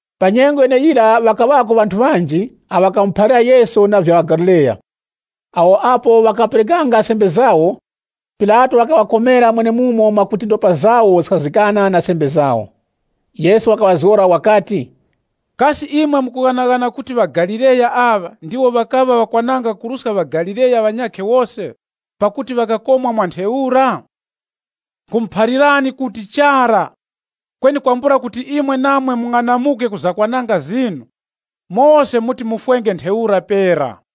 Pa nyengo yeneyira ŵakaŵako ŵanthu ŵanji awo ŵakamuphalira Yesu na vya ŵaGalileya awo apo ŵakaperekanga sembe zawo, Pilato wakaŵakomera mwenemumo mwakuti ndopa zawo zikasazgikana na sembe zawo. Yesu wakaŵazgora wakati, “Kasi imwe mukughanaghana kuti ŵaGalileya aŵa ndiwo ŵakaŵa ŵakwananga kuruska ŵaGalileya ŵanyakhe wose, pakuti ŵakakomwa mwa ntheura? Nkhumuphalirani kuti chara! Kweni kwambula kuti imwe namwe mung'anamuke ku zakwananga zinu, mose muti mufwenge ntheura pera.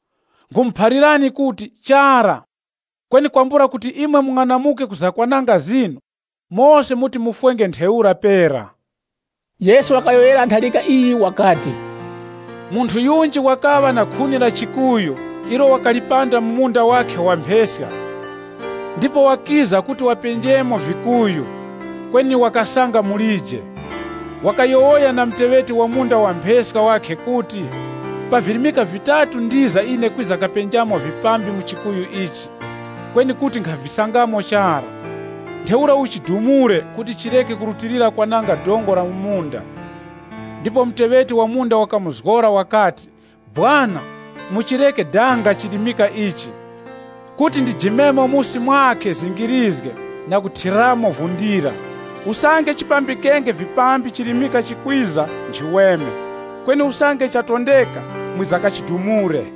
Nkhumuphalirani kuti chara! Kweni kwambula kuti imwe mung'anamuke ku zakwananga zinu, mose muti mufwenge ntheura pera.” Yesu wakaŵayowoyera ntharika iyi wakati, “Munthu yunji wakaŵa na khuni la chikuyu ilo wakalipanda mu munda wakhe wa mpheska, ndipo wakiza kuti wapenjemo vikuyu, kweni wakasanga mulije. Wakayowoya na muteŵeti wa munda wa mpheska wakhe kuti, ‘Pa virimika vitatu ndiza ine kwiza kapenjamo vipambi mu chikuyu ichi, kweni kuti nkhuvisangamo chara. Ntheura uchidumure kuti chireke kurutilira kwananga dongo la mu munda.’ Ndipo muteŵeti wa munda wakamuzgora wakati, ‘Sekuru, muchireke danga chirimika ichi, kuti ndijimemo musi mwakhe zingirizge na kuthiramo vundira. Usange chipambikenge vipambi chirimika chikwiza, nchiweme, kweni usange chatondeka mwizakachidumure.’”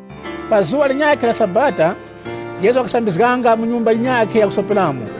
Pa zuŵa linyakhe la Sabata Yesu wakasambizganga mu nyumba yinyakhe yakusoperamo.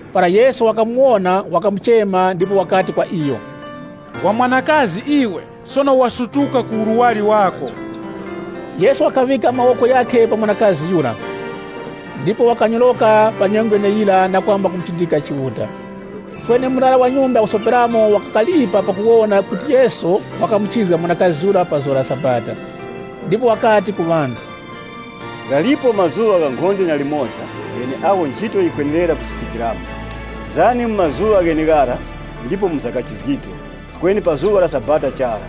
Para Yesu wakamuwona wakamuchema ndipo wakati kwa iyo, “Wa mwanakazi iwe sono wasutuka ku urwari wako.” Yesu wakaŵika mawoko ghakhe pa mwanakazi yura, ndipo wakanyoroka pa nyengo yeneyira, na kwamba kumuchindika Chiuta. Kweni murara wa nyumba ya kusoperamo wakakaripa pakuwona kuti Yesu wakamuchizga mwanakazi pa zuŵa la Sabata. Ndipo wakati ku ŵanthu, “Ghalipo mazuŵa ghankhonde na limoza gheneagho nchito yikwenera kuchitikiramo. Zani mu mazuŵa gheneghara ndipo mwizakachizgike, kweni pa zuŵa la Sabata chara.”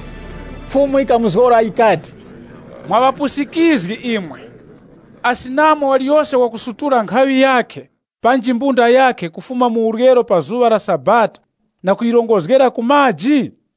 Fumu yikamuzgora yikati, “Mwa ŵapusikizgi imwe! Asi namwe waliyose wakusutula nkhaŵi yakhe panji mbunda yakhe kufuma mu uryero pa zuŵa la Sabata, na kuyirongozgera ku maji?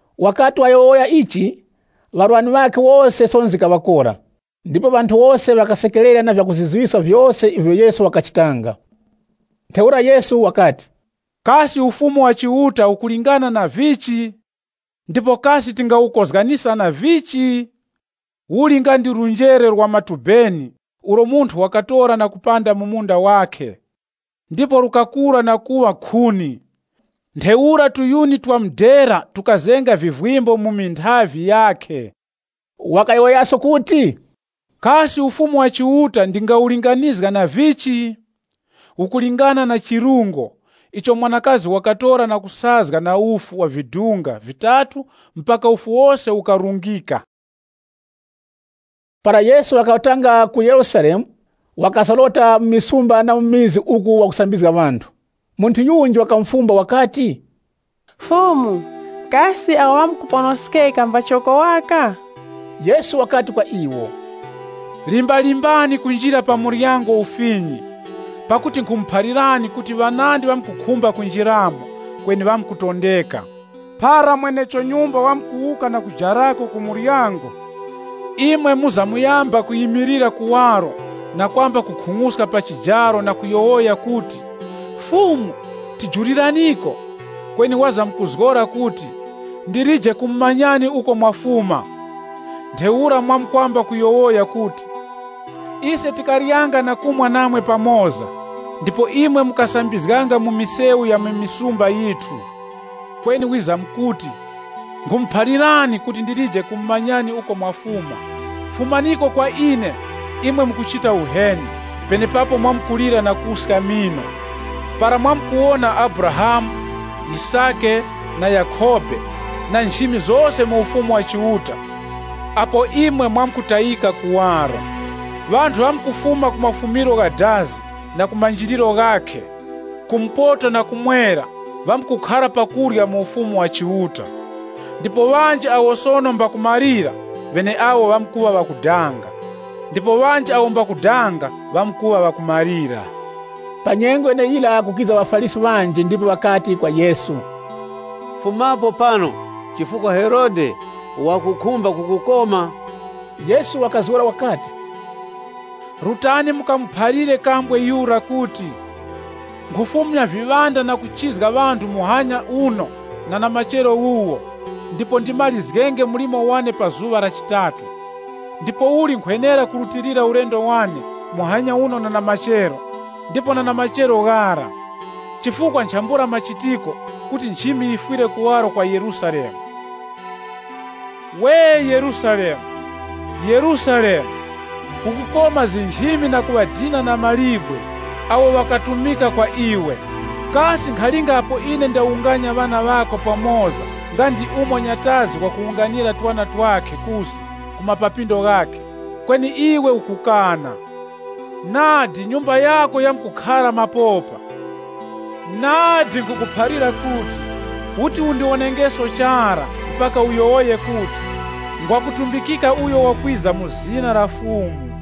Wakati wayowoya ichi, ŵarwani ŵakhe wose soni zikaŵakora, ndipo ŵanthu wose ŵakasekerera na vya kuzizwiska vyose ivyo Yesu wakachitanga. Ntheura Yesu wakati, “Kasi Ufumu wa Chiuta ukulingana na vichi? Ndipo kasi tingawulinganizga na vichi? Uli nga ndi njere la matubeni ulo munthu wakatora na kupanda mu munda wakhe. Ndipo lukakura na kuŵa khuni. Ntheura viyuni vya mudera vikazenga vivimbo mu minthavi yakhe.” Wakayowoyaso kuti, “Kasi Ufumu wa Chiuta ndingawulinganizga na vichi? Ukulingana na chirungo, icho mwanakazi wakatora na kusazga na ufu wa vidunga vitatu mpaka ufu wose ukarungika.” Para Yesu wakarutanga ku Yerusalemu, wakasorota mu misumba na mu vikaya uku wakusambizga ŵanthu. Munthu yunji wakamufumba wakati, “Fumu, kasi awo ŵamkuponoskeka mbachoko waka?” Yesu wakati kwa iwo, “Limbalimbani kunjira pa muryango ufinyi. Pakuti nkhumuphalirani kuti ŵanandi ŵamkukhumba kunjiramo, kweni ŵamkutondeka. Para mwenecho wa nyumba wamkuwuka na kujarako ku muryango, imwe muzamuyamba kuyimilira kuwaro na kwamba kukhung'uska pa chijaro na kuyowoya kuti, ‘Fumu, tijuliraniko.’ Kweni wamkuzgora kuti, ‘Ndilije kumumanyani uko mwafuma.’ Ntheura mwamkwamba kuyowoya kuti, ‘Ise tikaryanga na kumwa namwe pamoza, ndipo imwe mukasambizganga mu misewu ya misumba yithu.’ Kweni wizamkuti, ‘Nkhumuphalirani kuti ndilije kumumanyani uko mwafuma. Fumaniko kwa ine, imwe mukuchita uheni.’ Penepapo mwamkulira na kuswa mino, para mwamkuwona Abrahamu, Yisake, na Yakhobe, na nchimi zose mu Ufumu wa Chiuta, apo imwe mwamkutayika kuwaro. Ŵanthu ŵakufuma ku mafumiro gha dazi na ku manjiliro ghakhe, ku mpoto na ku mwera ŵamkukhara pa kurya mu Ufumu wa Chiuta. Ndipo ŵanji awo sono mbakumalira, ŵeneawo ŵamkuŵa ŵakudanga, ndipo ŵanji awo mbakudanga ŵamkuŵa ŵakumalira.” Pa nyengo yeneyira kukiza ŵaFarisi ŵanji ndipo ŵakati kwa Yesu, “Fumapo pano, chifukwa Herode wakukhumba kukukoma.” Yesu wakazgora wakati, “Rutani mukamuphalire kambwe kambwe: Wakurongora uryarya wa Herode. yura kuti, ‘Nkhufumya viŵanda na kuchizga ŵanthu muhanya uno na na machero wuwo, ndipo ndimarizgenge mlimo wane pa zuŵa la chitatu.’ Ndipouli nkhwenera kurutilira ulendo wane muhanya uno na na machero, ndiposo na na machero ghara. Chifukwa nchambula machitiko, kuti nchimi yifwire kuwaro kwa Yerusalemu. “We Yerusalemu, Yerusalemu! Ukukoma nchimi na kuŵadina na mawe awo ŵakutumika kwa iwe! Kasi nkhalinga apo ine ndawunganya ŵana ŵako pamoza nga ndi umo nyatazi wakuwunganyira twana twakhe kusi ku mapapindo ghakhe, kweni iwe ukakana! Nadi, nyumba yako yamkukhara mapopa! Nadi nkhukuphalira kuti, uti undiwonengeso chara mpaka uyowoye kuti, ‘Ngwakutumbikika uyo wakwiza mu zina la Fumu.’”